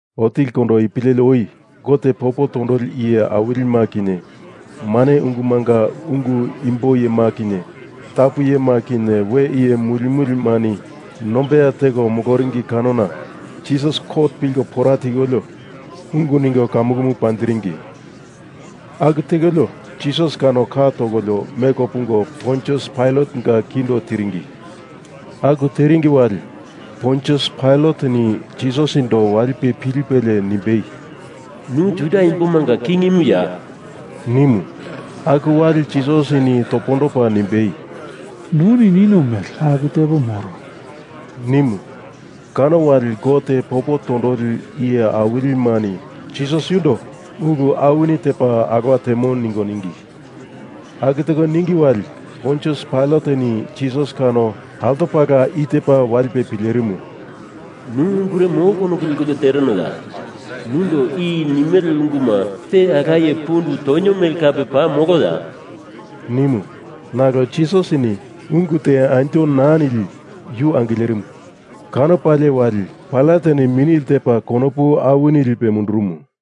Otilikondo ipu leli oi Gote popo tondoli iye awilima kinye mane ungumunga ungu imbo iyema kinye tapu iyema kinye we iye mulimulimani nombeya teko moloringi kanona Jisasi kot pilko pora tikolio ungu ningo kamukumu panjiringi. Aku tekolio Jisas kano ka tokolio meko pungo Pontius Pailatenga kindo tiringi. Aku teringi wali Pontius Pailateni Jisasindo walipe pilipelie nimbei, “Nu Juda imbomanga kingimuya?” nimu. Aku wali Jisasini topondopa nimbei, “Nuni nino mele aku tepo moro,” nimu. Kano wali Gote popo tondoli iye awilimani Jisas yundo ulu awini tepa alowa temo ningo ningi. Aku teko ningi wali, Pontius Pailateni Jisas kano altopala i tepa walipe pilerimu, “Nu ungure molo konopu lekolio terenoya? Nundo i nimele unguma te alaye pundu tonio mele kape paa moloya?” nimu. Nalo Jisasini ungu te anjo naa nili yu angilerimu. Kanopalie wali Pailateni mini ltepa konopu awini mundurumu.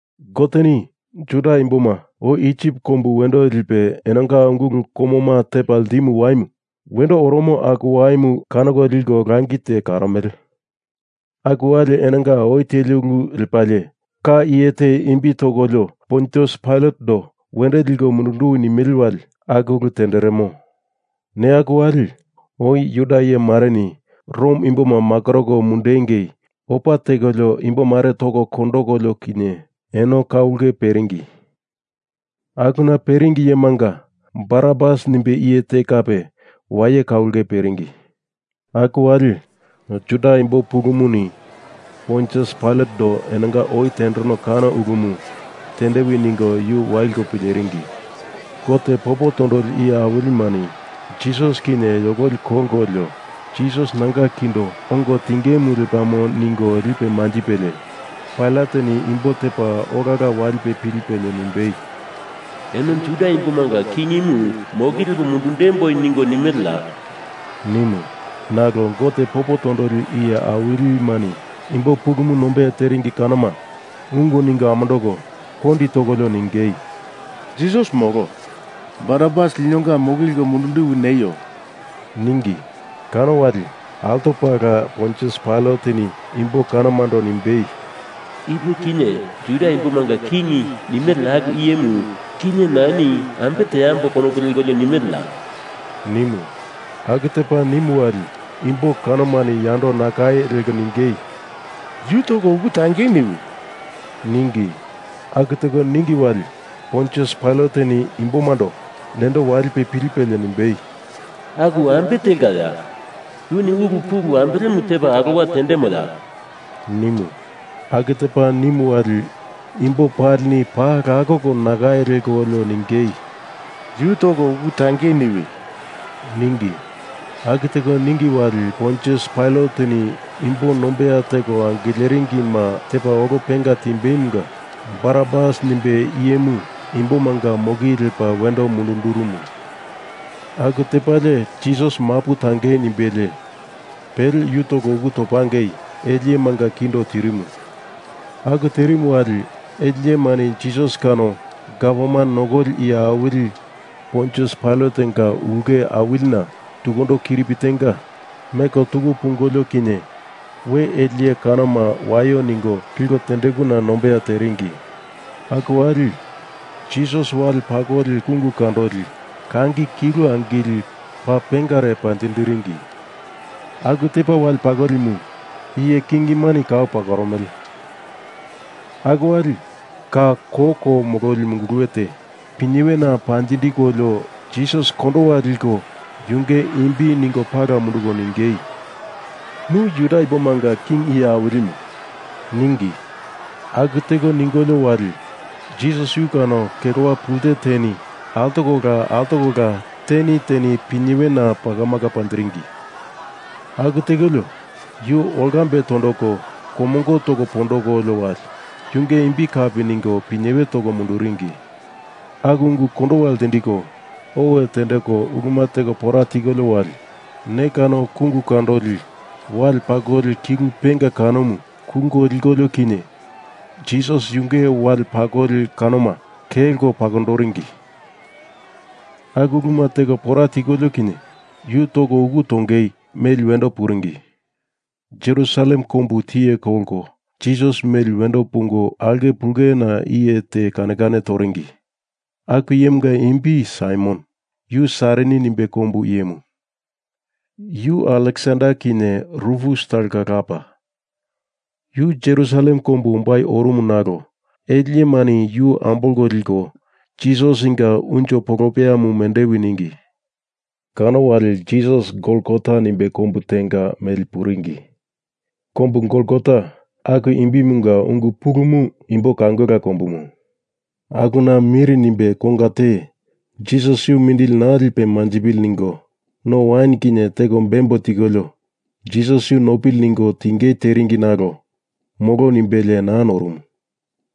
Goteni Juda imboma oi Isip kombu wendo lipe enonga ungulu komoma tepa ltimu waimu wendo oromo aku waimu kanoko liko langi te karomele. Aku wali enonga oi teli ulu lepalie ka iye te imbi tokolio Pontius Pailatendo wendo liko mundunduwi nimele wali aku ulu tenderemo. Neya aku wali oi Juda iye mareni Rom imboma makoroko mundungei opa tekolio imbomare toko kondokolio kinye eno ka ulke peringi. Akuna peringi iyemanga Barabas nimbe iye te kape waye ka ulke peringi. Aku wali Juda imbo pulumuni Pontius Pailatendo enonga oi tendereno kano ulumu tendewi ningo yu waliko pileringi. Gote popo tondoli iye awilimani Jisas kinye yokoli kolkolio Jisas nanga kindo ongo tingemu lepamo ningo lipe manjipelie Pailateni imbo tepa olala i walipe pilipelie nimbei, “Eno Juda imbomanga kingimu moki lepo mundundemboi ningo nimeleya?” nimu. Nalo Gote popo tondoli iye awilimani imbo pulumu nombeya teringi kanoma ungu ningo amondoko kondi tokolio ningei, “Jisas molo. Barabas linonga moki leko mundunduwi neio,” ningi. Kano wali altopala Pontius Pailateni imbo kanomando nimbei, “Ipe kinye Juda imbomanga king nimele aku iyemu kinye nani ambe teambo konopu lekolio nimeleya?” nimu. Aku tepa nimu wali imbo kanomani yando nakai leko ningei, “Yu toko uku tangei niwi,” ningi. Aku teko ningi wali Pontius Pailateni imbomando nendo walipe pilipelie nimbei, “Aku ambe telkaya? Yuni ulu pulu ambelemu tepa alowa tendemoya?” nimu. Aku tepa nimu wali imbo palini paa lakoko nakai lekolio ningei, “Yu toko uku tangei niwi” ningi. Aku teko ningi wali Pontius Pailateni imbo nombeya teko angileringima tepa olo penga timbeimunga Barabas nimbe iyemu imbomanga moki lepa wendo mundundurumu. Aku tepalie Jisas mapu tangei nimbelie pele yu toko uku topangei ele iyemanga kindo tirimu. Aku tirimu wali ele iyemani Jisas kano gavman nokoli iye awili Pontius Pailatenga ulke awilina tukundo kiripi tenga meko tuku pungolio kinye we ele iye kanoma waio ningo liko tendekuna nombeya teringi. Aku wali Jisas wale pakoli kungu kandoli kangi kilu angili paa pengare panjindiringi. Aku tepa wale pakolimu iye kingimani kau pakoromele. Aku wali ka koko mololi munguluwe te pinyewena panjindikolio Jisas kondowa likolio yunge imbi ningo pala munduko ningei, “Nu Juda imbomanga king iye awilimu,” ningi. Aku teko ningolio wali Jisas yu kano kelowa pulte teni altokola altokola teni teni pinyewena pakamaka panjiringi. Aku tekolio yu olkambe tondoko komongo toko pondokolio wali yunge imbi kapi ningo pinyewe toko munduringi. Aku ungu kondowa ltindiko owe tendeko uluma teko pora tikolio wali ne kano kungu kandoli wale pakoli kilu penga kanomu kulko likolio kinye Jisas yunge wale pakoli kanoma kelko pakondoringi. Aku uluma teko pora tikolio kinye yu toko uku tongei meli wendo puringi. Jerusalem kombu tiye kolko Jisas meli wendo pungo aulke pulena iye te kane kane toringi. Aku iyemunga imbi Saimon, yu Sairini nimbe kombu iyemu. Yu Aleksander kinye Rufus talonga lapa. Yu Jerusalem kombu ombai orumu nalo ele iyemani yu ambolko liko Jisasinga unjo polopeyamu mendewi ningi. Kano wali Jisas Golgota nimbe kombu tenga meli puringi. Kombu Golgota aku imbimunga ungu pulumu Imbo Kaungala Kombumu. Akuna mir nimbe konga te Jisas yu mindili naa lipe manjipili ningo no wain kinye teko bembo tikolio Jisas yu nopili ningo tingei teringi nalo molo nimbelie naa norumu.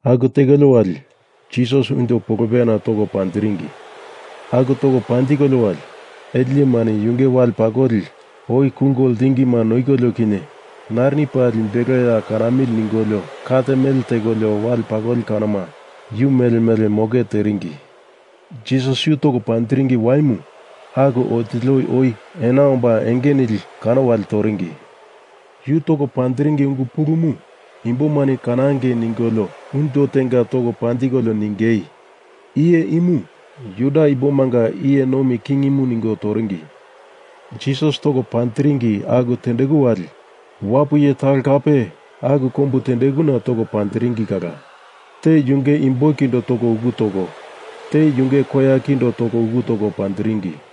Aku tekolio wali Jisas unjo polopeyana toko panjiringi. Aku toko panjikolio wali ele iyemani yunge wale pakoli oi kulko ltingima noikolio kinye narini paa limbeloya kanamili ningolio kat mele tekolio wale pakolima yu mele mele moke teringi. Jisas yu toko panjiringi waimu aku otili oi ena omba enge nili kano wali toringi. Yu toko panjiringi ungu pulumu imbomani kanange ningolio unjo tenga toko panjikolio ningei, IYE IMU JUDA IMBOMANGA IYE NOMI KINGIMU ningo toringi. Jisas toko panjiringi aku tendeku wali wapu iye talo kape aku kombuna toko panjiringi kala. Te yunge imbo kindo toko uku toko, te yunge koya kindo toko uku toko panjiringi.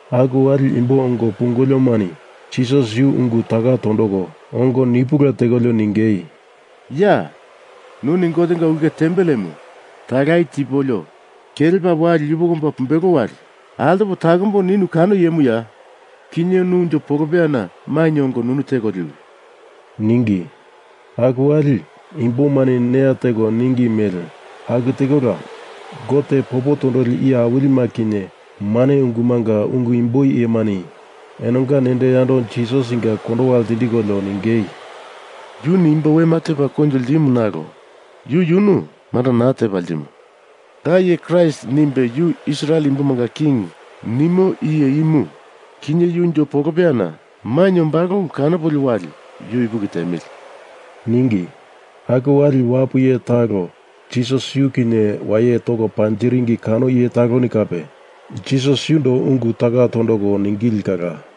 Aku wali imbo ongo pungoliomani Jisas yu ungu taka tondoko ongo nipula tekolio ningei, “Ya, nuni Gotenga ulke tempelemu talaye tipolio kelepa wali yupoko omba pumbelo wali altopo takombo ninu kano iyemuya? Kinye nu unjo polopeyana mainye ongo nunu teko liwi!” ningi. Aku wali imbomani neya teko ningi mele aku tekola Gote popo tondoli iye awilima kinye mane ungumunga ungu imbo iyemani enonga nendo yando Jisasinga kondowa ltindikolio ningei, “Yuni imbo wema tepa koinjo ltimu nalo yu yunu manda naa tepa ltimo. Da iye Kraist nimbe yu Israel imbomanga king nimo iye imu, kinye yu unjo polopeyana mainye ombalo ulu kanopolio wali yu ipuki tiemili,” ningi. Aku wali wapu iye talo Jisas yu kinye waye toko panjiringi kano iye taloni kape Jisas yundo ungu taka tondoko ningili kala.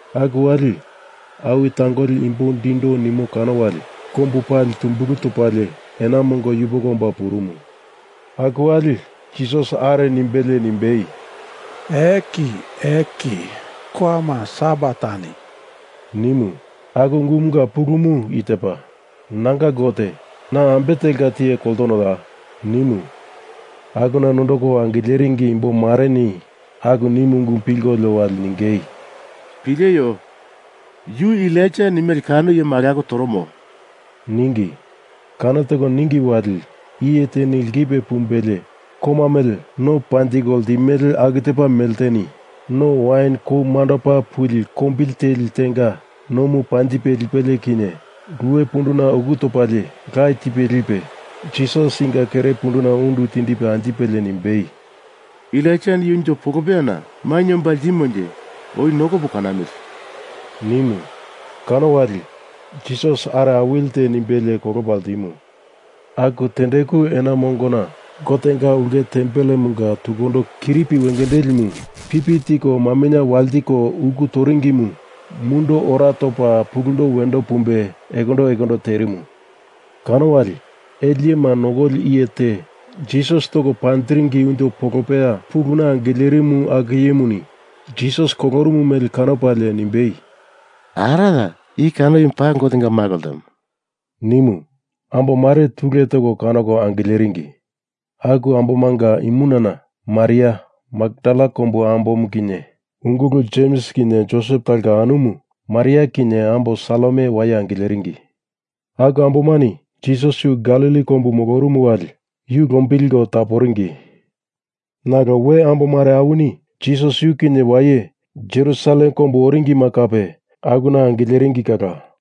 Aku wali awi tangoli imbo dindo nimo kano wali kombu pali tumbulu topalie ena mongo yupoko omba purumu. Aku wali Jisas are nimbelie nimbei, “Eli, Eli, lama sabaktani,” nimu. Aku ungumunga pulumu i tepa, “Nanga Gote, na ambe telka tiye koltonoya?” nimu. Akuna nondoko angileringi imbomareni aku nimu ungumu pilkolio wali ningei, “Pileio, yu Elaija nimele kano iyemu alako toromo,” ningi. Kano teko ningi wali iye teni lkipe pumbelie koma mele no panjiko ltimele aku tepa melteni no wain kou mandopa puli kombili teli tenga nomu panjipe lipelie kinye luwe punduna uku topalie la tipe lipe Jisasinga kere punduna undu tindipe anjipelie nimbei, “Elaijani yu unjo polopeyana mainye omba ltimonje, oi nokopo kanamili,” nimu. Kano wali Jisas are awilite nimbelie kolopa ltimu. Aku tendeku ena mongona Gotenga ulke tempelemunga tukundo kiripi wengendelimu pipi tiko maminye waltiko uku toringimu mundo ora topa pulundo wendo pumbe ekondo ekondo terimu. Kano wali ele iyema nokoli iye te Jisas toko panjiringi unjo polopeya puluna angilerimu akumuni Jisas kolorumu mele kanopalie nimbei, “Araya! I kano iyemu paa Gotenga Malo ltemo!” nimu. Ambomare tule teko kanoko angileringi. Aku ambomanga imunana Maria Makdala kombu ambomu kinye ungulu Jems kinye Josep talonga anumu Maria kinye ambo Salome waye angileringi. Aku ambomani Jisas yu Galili kombu molorumu wali yu lombilko taporingi. Nalo we ambomare awini Jisas yu kinye waye Jerusalem kombu oringima kape akuna angileringi kala.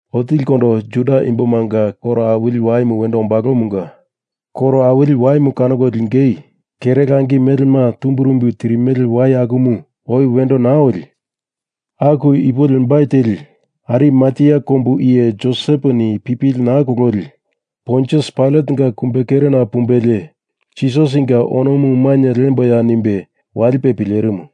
Otilikondo Juda imbomanga koro awili waimu wendo ombalomunga koro awili waimu kanoko lingei kere langi melema tumbirumbi tirimele wai akumu oi wendo naa oli, aku ipo lembai teli Arimatea kombu iye Joseponi pipili naa kololi Pontius Pailatenga kumbekerena pumbelie Jisasinga onomu mainye liemboya nimbe walipe pilerimu.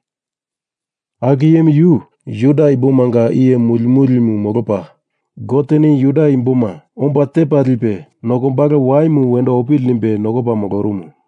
Aku iyemu yu Juda imbomanga iye mulimulimu molopa Goteni Juda imboma omba tepa lipe nokombalo waimu wendo opili nimbe nokopa molorumu.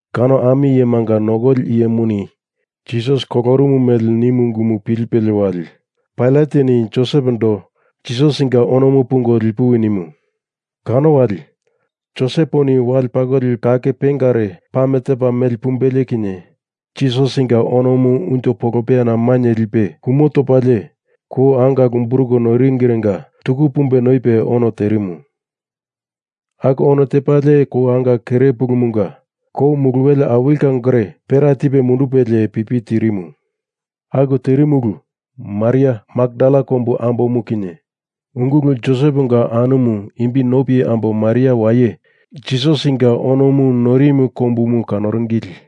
Kano ami iyemanga nokoli iyemuni Jisas kolorumu mele nimu ungumu pilipelie wali Pailateni Josepondo Jisasinga onomu pungo lipuwi nimu. Kano wali Joseponi wale pakoli kake pengare pame tepa meli pumbelie kinye Jisasinga onomu unjo polopeyana mainye lipe kumo topalie kou anga lumburuko noiringirenga tuku pumbe noipe ono terimu. Aku ono tepalie kou anga kere pulumunga kou muluwele awili kangore pera tipe mundupelie pipi tirimu. Aku terimu ulu Maria Makdala kombu ambomu kinye ungulu Joseponga anumu imbi nopi ambo Maria waye Jisasinga onomu noirimu kombumu kanoringili.